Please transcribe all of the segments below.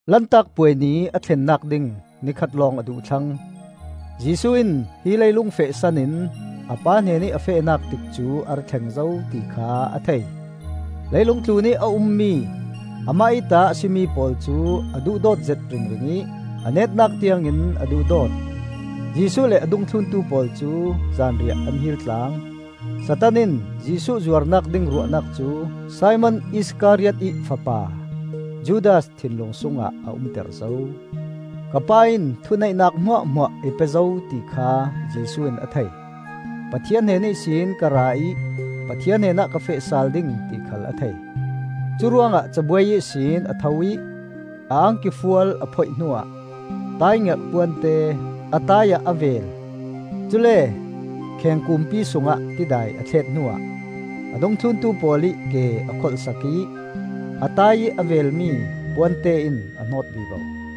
Lantak Puai ni a thlennak ding ni khat lawng a duh thlang. Jesuh in hi leilung fehsan in a Pa hnenih a fehnak tikcu a ra thleng zo ti kha a thei. Leilung tlunih a ummi amah ih ta a si mi pawl cu a duhdawt zet ringring ih a netnak tiangin a duhdawt. Jesuh le a dungthluntu pawl cu zanriah an hil tlang. Satan in Jesuh zuarnak ding ruahnak cu Simon Iskariot ih fapa Judas thinlung sungah a umter zo. Ka Pa in thuneihnak hmuahhmuah i pe zo ti kha Jesuh in a thei; Pathian hnen ihsin ka ra ih Pathian hnenah ka feh sal ding ti khal a thei. Curuangah cabuai ihsin a tho ih a angki fual a phoih hnuah taaingerh puante a taai ah a vel. Cule kheng kuumpi sungah tidai a thlet hnuah a dungthlun pawl ih ke a kholhsak ih a taai ih a velmi puante in a hnawt vivo.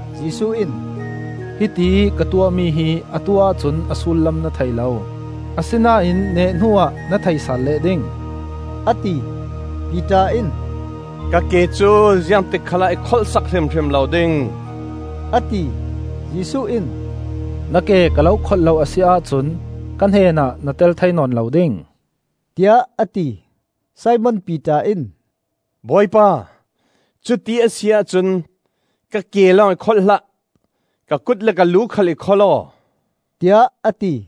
Jesuh in, “Hitiih ka tuahmi hi atu ahcun a sullam na thei lo, asinain neh hnuah na thei sal leh ding,” a ti. Piter in, “Ka ke cu ziangtik khalah i kholhsak hrimhrim lo ding,” a ti. Jesuh in, “Na ke ka lo kholh lo a si ahcun ka hnenah na tel thei nawn lo ding,” tiah a ti. Simon Piter in, “Bawipa, cuti a si ahcun, ka ke lawng i kholh hlah! Ka kut le ka lu khal i kholh aw,” tiah a ti.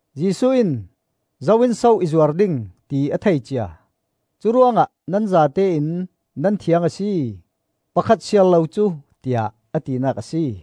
Jesuh in zo in so i zuar ding, ti a thei cia. Curuangah nan zatein nan thiang a si, pakhat siar lo cu, tiah a tinak a si.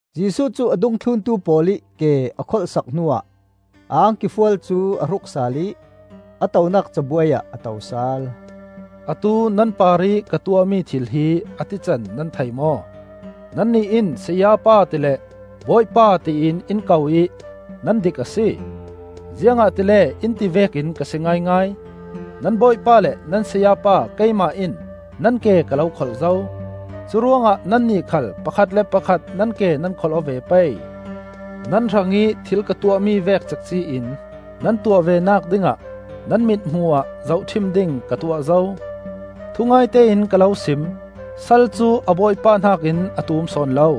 Jesuh cu a dungthluntu pawl ih ke a kholhsak hnuah a angki fual cu a hruk sal ih a tonak cabuai ah a to sal. “Atu nan parih ka tuahmi thil hi a tican nan thei maw? Nannih in, ‘Sayapa,’ tile ‘Bawipa,’ tiin in ko ih nan dik a si, ziangahtile in ti vekin ka si ngaingai. Nan Bawipa le nan Sayapa keimah in nan ke ka lo kholh zo. Curuangah nannih khal pakhat le pakhat nan ke nan kholh aw ve pei. Nan hrangih thil ka tuahmi vek cekci in nan tuah venak dingah nan mithmuh ah zohṭhim ding ka tuah zo. Thungaite in ka lo sim: sal cu a bawipa hnakin a tum sawn lo;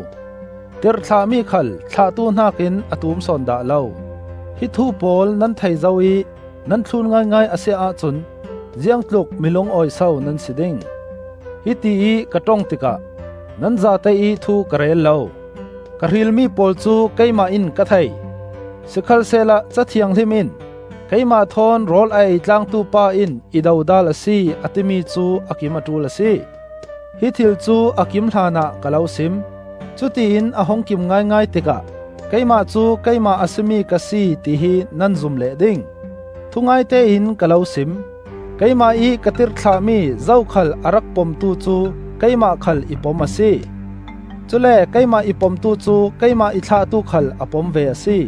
tirhthlahmi khal thlahtu hnakin a tum sawn dah lo. Hi thu pawl nan thei zo ih nan thlun ngaingai a si ahcun ziangtluk mi lungawi so nan si ding? “Hitiih ka ṭong tikah nan zate ih thu ka rel lo. Ka hrilmi pawl cu keimah in ka thei. Sikhalsehla Ca Thianghlim in ‘Keimah thawn rawl a ei tlangtu pa in i dodal a si,’ a timi cu a kim a ṭul a si. Hi thil cu a kim hlanah ka lo sim: cutiin a hung kim ngaingai tikah ‘Keimah cu Keimah a si mi ka si’ tihi nan zum leh ding. Thungaite in ka lo sim: Keimah ih ka tirhthlahmi zokhal a rak pomtu cu keimah khal i pom a si; cule keimah i pomtu cu keimah i thlahtu khal a pom ve a si,”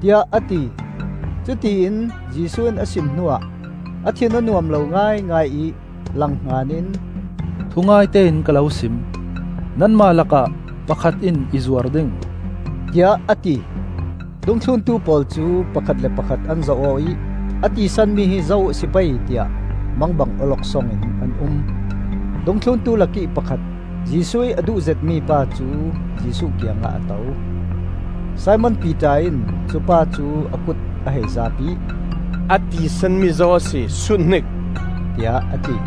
tiah a ti. Cutiin Jesuh in a sim hnuah a thin a nuam lo ngaingai ih langhngan in, “Thungaite in ka lo sim: nanmah lakah pakhat in i zuar ding,” tiah a ti. Dungthluntu pawl cu pakhat le pakhat an zoh aw ih a tisanmi hi zo a si pei tiah mangbang awloksong in an um. Dungthluntu lakih pakhat, Jesuh ih a duh zetmi pa cu Jesuh kiang ah a to. Simon Piter in cupa cu a kut a hei zaap ih, “A tisanmi zo a si, sut hnik,” tiah a ti.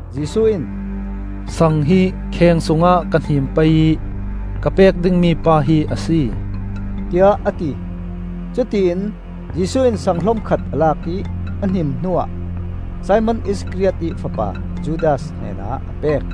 Jesuh in, “Sang hi kheng sungah ka hnim pei ih ka pek dingmi pa hi a si,” tiah a ti. Cutiin Jesuh in saang hlom khat a lak ih a hnim hnuah Simon Iskariot ih fapa Judas hnenah a pek.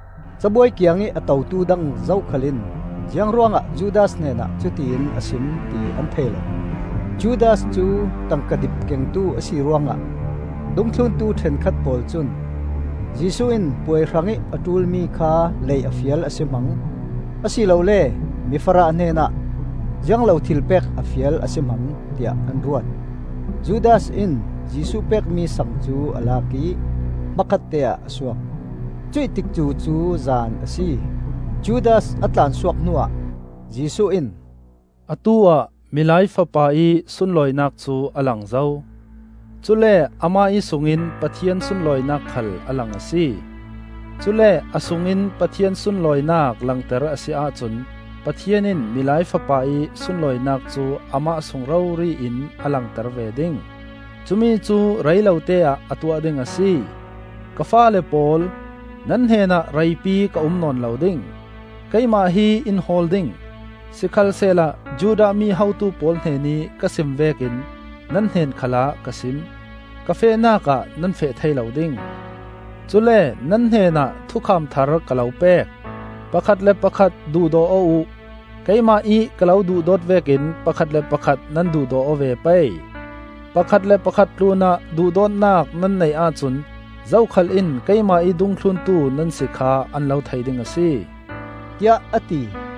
Cabuai kiangih a totu dang zokhal in ziang ruangah Judas hnenah cutiin a sim ti an thei lo. Judas cu tangka dip kengtu a si ruangah dungthluntu ṭhenkhat pawl cun Jesuh in puai hrangih a ṭulmi kha lei a fial a si hmang, a si lole mi farah hnenah ziang lo thil pek a fial a si hmang, tiah an ruat. Judas in Jesuh pekmi sang cu a lak ih hmakhatte ah a suak. Cuih tikcu cu zan a si. Judas a tlansuak hnuah Jesuh in, “Atu-ah Milai Fapa ih sunlawinak cu a lang zo; cule amah ih sungin Pathian sunlawinak khal a lang a si. Cule a sungin Pathian sunlawinak langter a si ahcun Pathian in Milai Fapa ih sunlawinak cu amah sung rori in a langter ve ding. Cumi cu rei lote-ah a tuah ding a si. Ka faale pawl, nan hnenah reipi ka um nawn lo ding. Keimah hi in hawl ding; sikhalsehla Judah mi hotu pawl hnenih ka sim vekin nan hnen khalah ka sim: ‘Ka fehnak ah nan feh thei lo ding.’ Cule nan hnenah thukham thar ka lo pek: Pakhat le pakhat duhdaw aw uh! Keimah ih ka lo duhdawt vekin pakhat le pakhat nan duhdaw aw ve pei. Pakhat le pakhat tlunah duhdawtnak nan neih ahcun zokhal in keimah ih dungthluntu nan si kha an lo thei ding a si,” tiah a ti.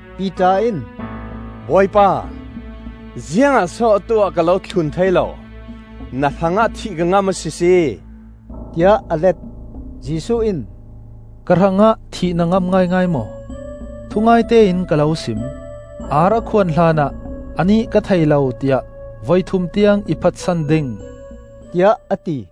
Piter in, “Bawipa, ziangah so atu-ah ka lo thlun thei lo? Na hrangah thih ka ngam a sisi!” tiah a let. Jesuh in, “Ka hrangah thih na ngam ngaingai maw? Thungaite in ka lo sim: ar a khuan hlanah anih ka thei lo, tiah voi thum tiang i phatsan ding,” tiah a ti.